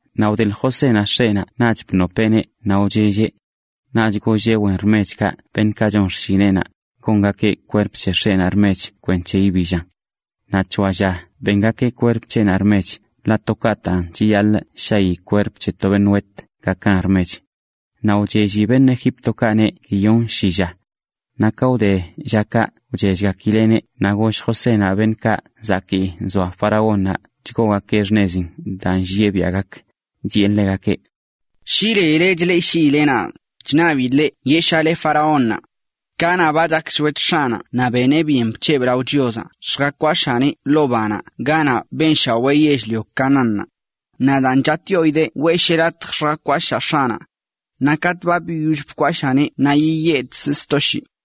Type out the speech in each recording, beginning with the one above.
Naꞌ wdeḻ Josénaꞌ x̱eꞌnaꞌ naꞌch bnopeꞌneꞌ naꞌ wchelleꞌ. Naꞌch golleꞌ wen rmechkaꞌ beṉꞌkaꞌ chon xshineꞌnaꞌ, gongakeꞌ kwerp c̱he x̱eꞌnaꞌ rmech kwenc̱he ibillan. Naꞌ c̱hoa lla bengakeꞌ kwerp c̱heꞌnaꞌ rmech ḻaꞌ to kaꞌtaꞌn chiyaḻꞌ shayi kwerp c̱he to beṉꞌ wet gakan rmech. Naꞌ wchelli beṉꞌ Egíptokaꞌneꞌ guiyonshi lla. Naꞌ ka wde llakaꞌ wchellgakileꞌneꞌ naꞌ goll Josénaꞌ beṉꞌkaꞌ zakii nzoa faraónnaꞌ chgoogakeꞌ xṉezin daa nllieꞌ biaꞌ gak, chiꞌe ḻegakeꞌ: ―Shi leile chleꞌshiile nadꞌ, chṉabidꞌ leꞌ yeꞌshale faraónnaꞌ: “Kanaꞌ ba chak shwet x̱aꞌnaꞌ naꞌ beneꞌ byen bc̱hebꞌ lao Chiozaꞌ lljakwashaaneꞌ ḻoo banaꞌ ganaꞌ benshawee yell-lio Canaánnaꞌ. Naꞌ daan chatꞌyoidee weꞌsheꞌ latj lljakwashaa x̱aꞌnaꞌ. Naꞌ katꞌ ba biyoll bkwashaaneꞌ naꞌ yiyedkzꞌ sto shii.”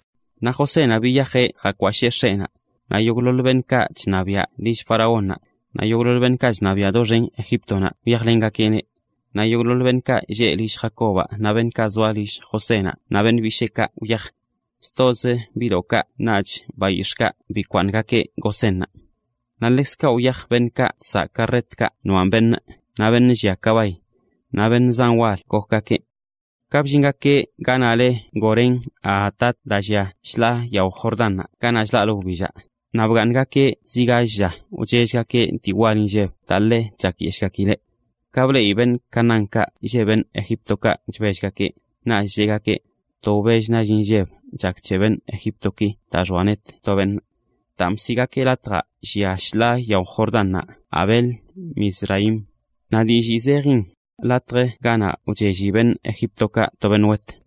Naꞌ Josénaꞌ biyajeꞌ jakwashee x̱eꞌnaꞌ. Naꞌ yogꞌḻoḻ beṉꞌkaꞌ chṉabiaꞌ lill faraónnaꞌ, naꞌ yogꞌḻoḻ beṉꞌkaꞌ chṉabiaꞌ doxen Egíptonaꞌ wyajlengakeꞌneꞌ. Naꞌ yogꞌḻoḻ beṉꞌkaꞌ lleꞌ lill Jacobaꞌ, naꞌ beṉꞌkaꞌ zoa lill Josénaꞌ naꞌ beṉꞌ bisheekaꞌ wyaj. Stozə biꞌdoꞌkaꞌ naꞌch bayix̱ꞌkaꞌ bikwaaṉgakeꞌ Gosénnaꞌ. Naꞌ ḻekzkaꞌ wyaj beṉꞌkaꞌ chsaꞌ karretkaꞌ noaꞌn beṉꞌ, naꞌ beṉꞌ llia kabay. Naꞌ beṉꞌ zan wal gokgakeꞌ. Ka bllingakeꞌ ganaꞌ leꞌ Atad daa llia shḻaa yao Jordánnaꞌ ganaꞌ chlaꞌlə wbillaꞌ, naꞌ bgaaṉgakeꞌ zi gall lla wchellgakeꞌ dii wal inlleb daa ḻe chakyeshꞌgakileꞌ. Ka bleꞌi beṉꞌ Canaánkaꞌ lleꞌ beṉꞌ Egíptokaꞌ chbellgakeꞌ, naꞌch cheꞌgakeꞌ: “To wbell nall inlleb chak c̱he beṉꞌ Egíptoki daa []xoa net to beṉꞌ.” Daan bsiꞌgakeꞌ latjaꞌ llia shḻaa yao Jordannaꞌ Abel-mizraim. Naꞌ dillii zejin: latj ganaꞌ wchelli beṉꞌ Egíptokaꞌ to beṉꞌ wet.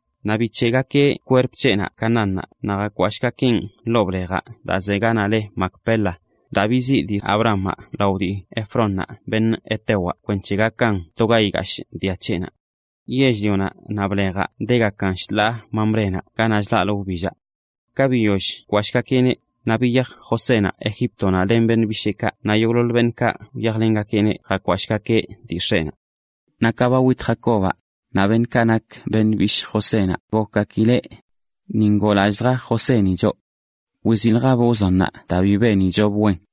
Naꞌ bic̱heꞌgakeꞌ kwerp c̱heꞌnaꞌ Canaánnaꞌ naꞌ jakwashꞌgakeꞌn ḻoo blejaꞌ daa ze ganaꞌ le Macpela, daa biziꞌ dii Abrahamaꞌ lao dii Efrónnaꞌ beṉꞌ hetewaꞌ, kwenc̱he gakan to ga igashꞌ dia c̱heꞌnaꞌ. Yell-lionaꞌ naꞌ blejaꞌ degakan shḻaa Mamrénaꞌ ganaꞌ chlaꞌlə wbillaꞌ. Ka biyoll bkwashꞌgakeꞌneꞌ, naꞌ biyaj Josénaꞌ Egíptonaꞌ len beṉꞌ bisheekaꞌ naꞌ yogꞌḻoḻ beṉꞌkaꞌ wyajlengakeꞌneꞌ jakwashꞌgakeꞌ dii x̱eꞌnaꞌ. Naꞌ ka ba wit Jacobaꞌ, naꞌ beṉꞌkaꞌ nak beṉꞌ bishꞌ Josénaꞌ gokgakileꞌ: “Ni ngoolallꞌlja Joséni choꞌ. Wiziꞌljabꞌ wzonnaꞌ c̱heyi daa benichobꞌ.”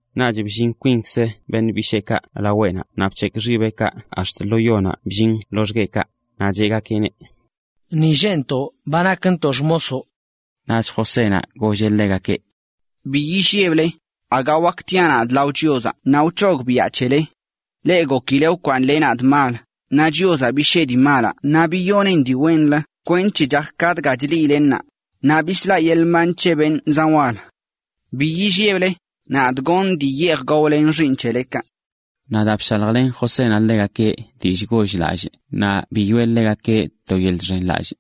Naꞌch bllin kwinkz beṉꞌ bisheekaꞌ laweꞌnaꞌ naꞌ bc̱hekꞌ xibeꞌkaꞌ ax̱t lo yonaꞌ bllin loxgueꞌkaꞌ, naꞌ cheꞌgakeꞌneꞌ: ―Ni lleꞌntoꞌ ba nakntoꞌ xmosoꞌ. Naꞌch Josénaꞌ golleꞌ ḻegakeꞌ: ―Bi illeble. Aga wakə tiaꞌ nadꞌ lao Chiozaꞌ naꞌ wc̱hogbiꞌa c̱hele. Leꞌ gokileꞌ wkwaaṉle nadꞌ mal, naꞌ Chiozaꞌ bishee dii malaꞌ naꞌ biyoneꞌn dii wenlə kwenc̱he chak ka dga chleꞌile ṉaa, naꞌ bislaꞌ yeḻꞌ mban c̱he beṉꞌ zan wal. Bi illeble, nadꞌ gonꞌ dii yeej gaole len xiiṉ c̱helekaꞌ. Naꞌ daa bshaljlen Josénaꞌ ḻegakeꞌ dillꞌ goll-lallꞌ naꞌ biyoꞌe ḻegakeꞌ to yeḻꞌ chxenlallꞌ.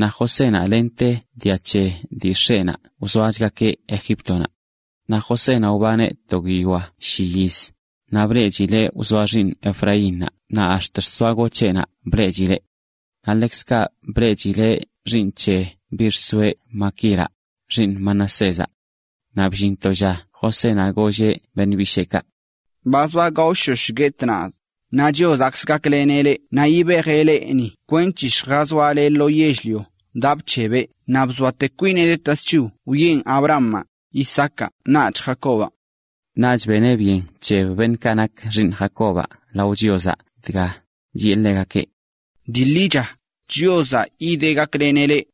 Naꞌ Josénaꞌ lente dia c̱he dii x̱eꞌnaꞌ wzoachgakeꞌ Egíptonaꞌ. Naꞌ Josénaꞌ wbaneꞌ to guiyoa shi yiz, naꞌ bleꞌchileꞌ wzoa xiiṉ Efraínnaꞌ naꞌ ax̱t xsoagoc̱heꞌnaꞌ bleꞌchileꞌ. Naꞌ ḻekzkaꞌ bleꞌchileꞌ xiiṉ c̱he biꞌ xsoeꞌ Maquiraꞌ, xiiṉ Manasézaꞌ. Naꞌ bllin to lla Josénaꞌ golleꞌ beṉꞌ bisheekaꞌ: “Ba zoa gaoshosh guetꞌ, naꞌ Chiozaꞌkzə gakleneꞌ leꞌ naꞌ yibejeꞌ leꞌ ni kwenc̱he lljazoale lo yell-lio daa bc̱hebeꞌ wiꞌe Abrahamaꞌ, Isaacaꞌ naꞌch Jacobaꞌ.” Naꞌch beneꞌ byen bc̱heb beṉꞌkaꞌ nak xiiṉ Jacobaꞌ lao Chiozaꞌ, chiꞌe ḻegakeꞌ: “Dii ḻicha, Chiozaꞌ yideꞌ gakleneꞌ leꞌ.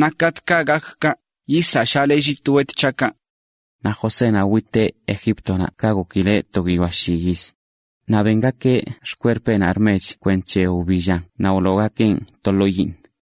Naꞌ katꞌkaꞌ yibejeꞌ leꞌ ni, yisaꞌshale llit wet c̱haꞌkaꞌ.” Naꞌ Josénaꞌ witeꞌ Egíptonaꞌ ka gokileꞌ to guiyoa shi yiz, naꞌ bengakeꞌ xkwerpeꞌnaꞌ rmech kwenc̱he wbillan naꞌ wloogakeꞌn to ḻoo yiiṉ.